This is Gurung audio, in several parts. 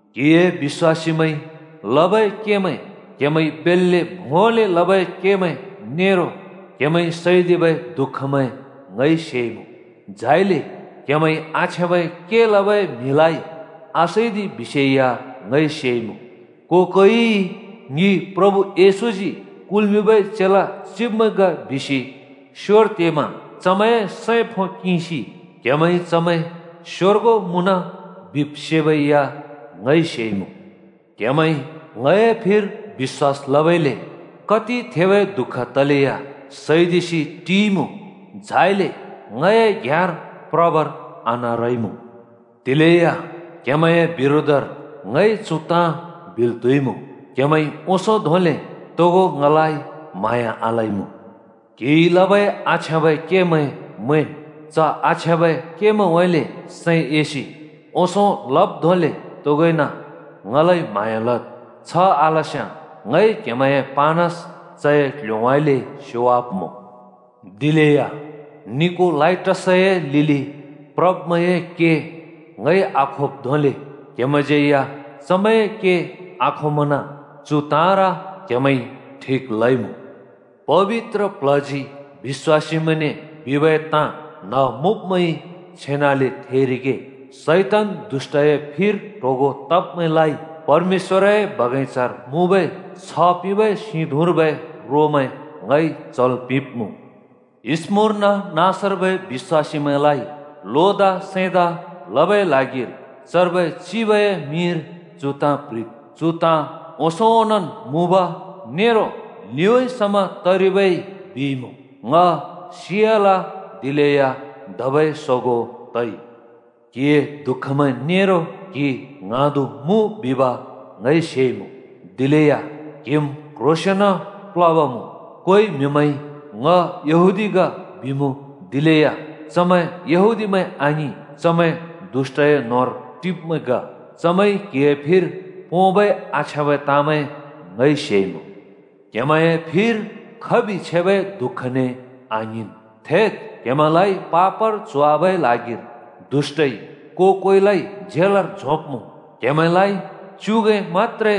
क्हिए बिश्‍वासीमैंइ लबै केमैं, क्हेमैंइ बेल्‍ले भोंले लबै केमैं नेरो क्हेमैंइ सैदिबै दु:खमैं ङइ सेइमुँ। झाइले क्हेमैंइ आछ्याँबै के लबै म्हिमैंलाइ आसैदि बिसे या ङइ सेइमुँ। को-कोइइ ‘ङि प्रभु येशूजी कुल्मिंबै चेला चिब्मैं ग’ बिसि स्योर तेमा चमैंए सैं फो किंसि क्हेमैंइ चमैं स्‍योर्गों मुँन बिब् सेबै या ङइ सेइमुँ। क्हेमैंइ ङए फिर बिश्‍वास लबइले कति थेबै दुःख तलेया सैदिसि टिइमुँ, झाइले ङए घ्याँर प्रबर आनारइमुँ। दिलेया क्हेमैंए बिरोधर ङइ चु ताँ बिल् त्हुइमुँ: क्हेमैंइ ओंसों धोंले तोगो ङलाइ म्हाँया आलइमुँ। क्हिइ लबै आछ्याँबै केमैं मैंन्। च आछ्याँबै केमैंउँइँले सैं एसि ओंसों लब् धोंले तोगोइन ङलाइ म्हाँया लद्। छ आलस्‍याँ ङइ क्‍हेमैंए पानस चए क्‍ल्‍होउँइँले स्‍योवाब्‍मुँ। दिलेया निकोलाइटसए लिलि प्रब्मैंए के ङइ आखोब् धोंले क्‍हेमैंज्यै या चमैंए के आखोमना, चु ताँर क्हेमैंइ ठिक लइमुँ। “पबित्र प्ल्हजी बिश्‍वासीमैंने बिबै ताँ न्‍ह मुँब्मैंइ छेनाले थेरिगे। “शैतान दुष्‍टए फिर ट्होगों तब्मैंलाइ परमेश्‍वरए बगैंचार मुँबै छ्ह पिंबै सिं धुँर्बै रोमैं ङइ चल् पिंब्‍मुँ।” “स्‍मुर्ना नाँसर्बै बिश्‍वासीमैंलाइ लोदा सैंदा लबै ल्हागिर चर्बै चिबए मिंर चु ताँ प्‍ह्रिद् बिसि येशूजी यूहन्‍नाने ल्हैदिइ: “चु ताँ ओंसों ओनोंन् मुँब नेरो लिउँइँ समा तरिबै येशूजी बिइमुँ, ङ सियाल, दिलेया धबै सोगों तइ। क्‍हिए दुःखमैं नेरो क्‍हि ङ्हाँदु मुँ बिब ङइ सेइमुँ। दिलेया क्‍हिम् क्‍ह्रोंसेंन प्लब मुँ। कोइ म्‍हिमैंइ ‘ङ यहूदी ग,’ बिमुँ, दिलेया चमैं यहूदीमैं आङिं, चमैं दुष्‍टए न्होंर टिब्‍मैं ग। चमैंइ क्‍हिए फिर पोंबै आछ्याँबै ताँमैं ङइ सेइमुँ। क्हेमैंए फिर खबि छेबै दुःखने आङ्हिंन्। थेद्, क्‍हेमैंलाइ पापर च्होवाबै ल्हागिर दुष्‍टइ को-कोइलाइ झेलर झोंब्‍मुँ। क्‍हेमैंलाइ च्‍युगैं मत्‍त्रे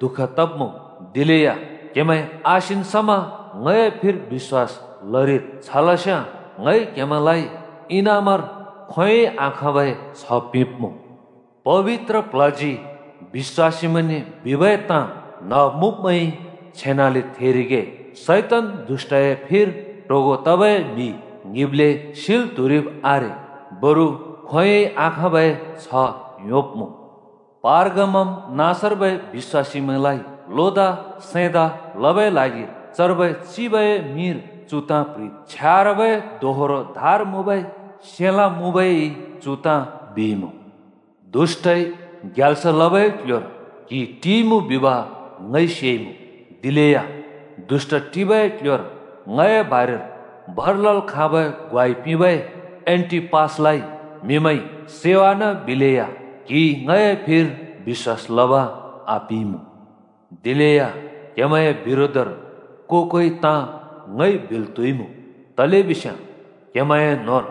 दुःख तब्‍मुँ। दिलेया क्‍हेमैं आसिन् समा ङए फिर बिश्‍वास लरिद्, छलस्याँ ङइ क्‍हेमैंलाइ इनामर खोंयोंइ आखाँबै छ्ह पिंब्मुँ। “पबित्र प्ल्हजी बिश्‍वासीमैंने बिबै ताँ न्‍ह मुँब्मैंइ छेनाले थेरिगे। “शैतान दुष्‍टए फिर ट्होगों तबै म्हि ङ्हिंब्ले सिल् त्हुरिब् आरे, बरु खोंयोंइ आखाँबै छ्ह योंब्मुँ।” “पर्गामम नाँसर्बै बिश्‍वासीमैंलाइ लोदा सैंदा लबै ल्हागिर चर्बै चिबए मिंर चु ताँ प्‍ह्रिद् बिसि येशूजी यूहन्‍नाने ल्हैदिइ: “छ्यारबै दोहोरो धार मुँबै सेलाँ मुँबै येशूजी चु ताँ बिइमुँ: दुष्‍टइ ग्याल्स लबै क्ल्ह्‍योर क्‍हि टिइमुँ बिब ङइ सेइमुँ। दिलेया दुष्‍ट टिबै क्‍ल्‍ह्‍योर ङए बारेर भर लल् खाँबै ग्वाइ पिंबै एण्‍टिपासलाइ म्‍हिमैंइ सैवानाबिलेया क्‍हिइ ङए फिर बिश्‍वास लब आपिइमुँ। दिलेया क्हेमैंए बिरोधर को-कोइ ताँ ङइ बिल् त्हुइमुँ, तलेबिस्याँ क्हेमैंए न्होंर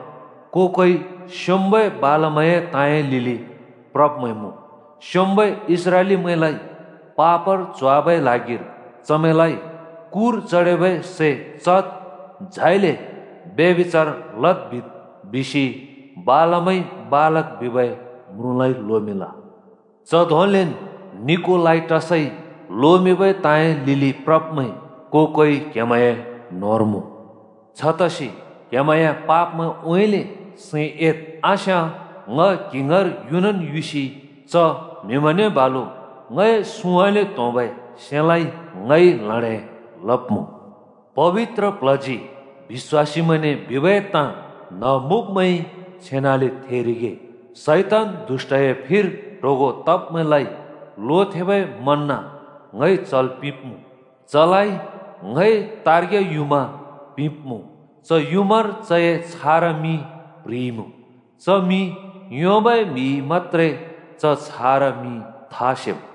को-कोइ स्‍योंम्‍बै बालामए ताँए लिलि प्रब्मैं मुँ। स्योंम्बै इस्राएलीमैंलाइ पापर च्होवाबै ल्हागिर ‘चमैंलाइ कुर चडेबै सै चद्, झाइले ब्यभिचार लद् बिद्,’ बिसि बालामइ बालाक बिबै म्रुँलाइ लोमिंल। च धोंलेन् निकोलाइटसइ लोमिंबै ताँए लिलि प्रब्मैं को-कोइ क्हेमैंए न्होंर मुँ। छतसि क्हेमैंए पापमैंउँइँले सैं एद्। आस्‍याँ ङ क्‍हि ङाँर युनन् युसि च म्‍हिमैंने बालु ङए सुँउँइँले त्‍होंबै सेलाँइ ङइ ल्हडें लब्‍मुँ। “पबित्र प्ल्हजी बिश्‍वासीमैंने बिबै ताँ न्ह मुँब्मैंइ छेनाले थेरिगे। “शैतान दुष्‍टए फिर ट्होगों तब्मैंलाइ लोथेंबै मन्‍न ङइ चल् पिंब्‍मुँ। चलाइ ङइ तार्ग्या युँमा पिंब्‍मुँ। च युँमार चए छारा मिं प्ह्रिइमुँ। च मिं योंबै म्‍हिइ मत्‍त्रे च छारा मिं था सेम्।”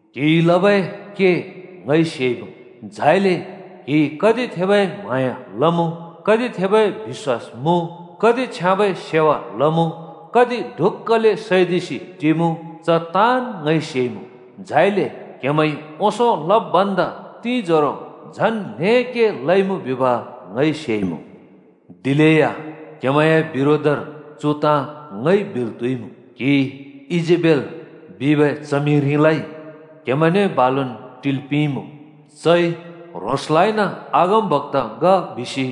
क्‍हिइ लबै के ङइ सेइमुँ। झाइले क्‍हिइ कति थेबै म्हाँया लमुँ, कति थेबै बिश्‍वास मुँ, कति छ्याँबै सेवा लमुँ, कति ढुक्‍कले सैदिसि टिमुँ, च ताँन् ङइ सेइमुँ। झाइले क्‍हेमैंइ ओंसों लब् भन्दा तिंजोरो झन् ल्हें के लइमुँ बिब् ङइ सेइमुँ। दिलेया क्‍हेमैंए बिरोधर चु ताँ ङइ बिल् त्हुइमुँ: क्‍हिइ ईजेबेल बिबै च्हमिरिलाइ क्हेमैंने बालुन् टिल् पिंइमुँ। चइ ह्रोंसलाइन अगमबक्‍ता ग बिसि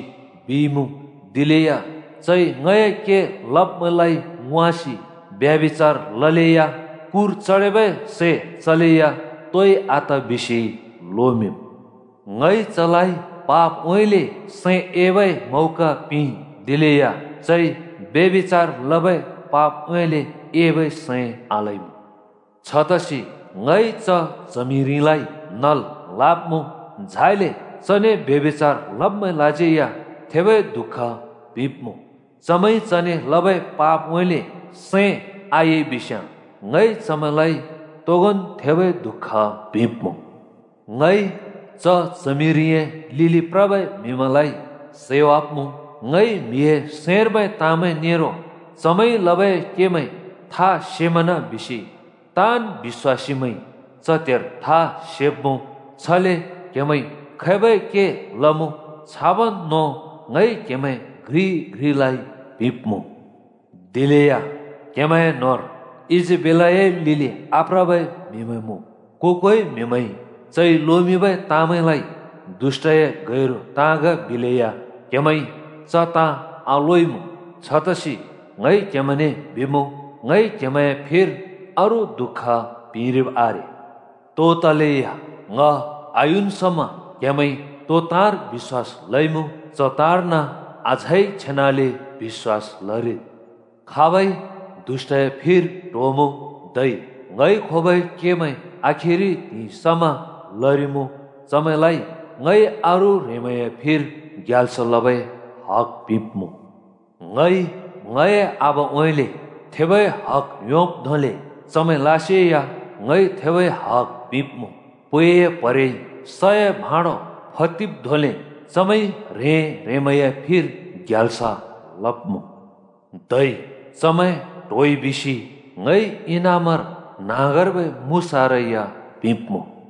बिइमुँ, दिलेया चइ ङए के लब्‍मैंलाइ वाँसि ब्यभिचार लले या, कुर चडेबै सै चले या तोइ आत बिसि लोमिंम्। ङइ चलाइ पापउँइँले सैं एबै मौका पिंइ, दिलेया चइ ब्यभिचार लबै पापउँइँले एबै सैं आलइमुँ। छतसि ङइ च च्हमिरिलाइ नल् लब्‍मुँ, झाइले चने ब्यभिचार लब्‍मैंलाज्यै या थेबै दुःख पिंब्‍मुँ। चमैंइ चने लबै पापउँइँले सैं आएइबिस्‍याँ ङइ चमैंलाइ तोगोंन् थेबै दुःख पिंब्‍मुँ। ङइ च च्हमिरिए लिलि प्रबै म्‍हिमैंलाइ सैवाब्‍मुँ। ङइ म्‍हिए सैंर्बै ताँमैं नेरो चमैंइ लबै केमैं था सेमना बिसि ताँन् बिश्‍वासीमैंइ च त्हेर था सेब्‍मुँ, छले क्‍हेमैंइ खैबै के लमुँ, छाबन् नों ङइ क्हेमैं घ्रि घ्रिलाइ पिंब्‍मुँ। “दिलेया क्‍हेमैं न्होंर ईजेबेलए लिलि आप्रबै म्हिमैं मुँ। को-कोइ म्‍हिमैंइ चइ लोमिंबै ताँमैंलाइ ‘दुष्‍टए गैरु ताँ ग’ बिलेया क्‍हेमैंइ च ताँ आलोइमुँ। छतसि ङइ क्‍हेमैंने बिमुँ, ङइ क्‍हेमैंए फिर अरू दु:ख पिंरिब आरे। तो तलेया ङ आयुन् समा क्‍हेमैंइ तो ताँर बिश्‍वास लइमुँ, च ताँर्न अझै छेनाले बिश्‍वास लरिद्। “खाब‍इ दुष्‍टए फिर ट्होमुँ, धै ङइ खोबै केमैं आखिरि त्हिंइ समा लरिमुँ, चमैंलाइ ङइ अरू ह्रेंमैंए फिर ग्याल्स लबै हग पिंब्‍मुँ। ङइ ङए आबाउँइँले थेबै हग योंब् धोंले चमैंलासे या ङइ थेबै हग पिंब्‍मुँ। पैए प्हरेइ सए भाँडो फदिवाब् धोंले चमैंइ ह्रें-ह्रेंमैंए फिर ग्याल्स लब्‍मुँ। धै चमैं ट्होइ बिसि ङइ इनामर न्‍हाँगर्बै मुसारा या पिंब्‍मुँ।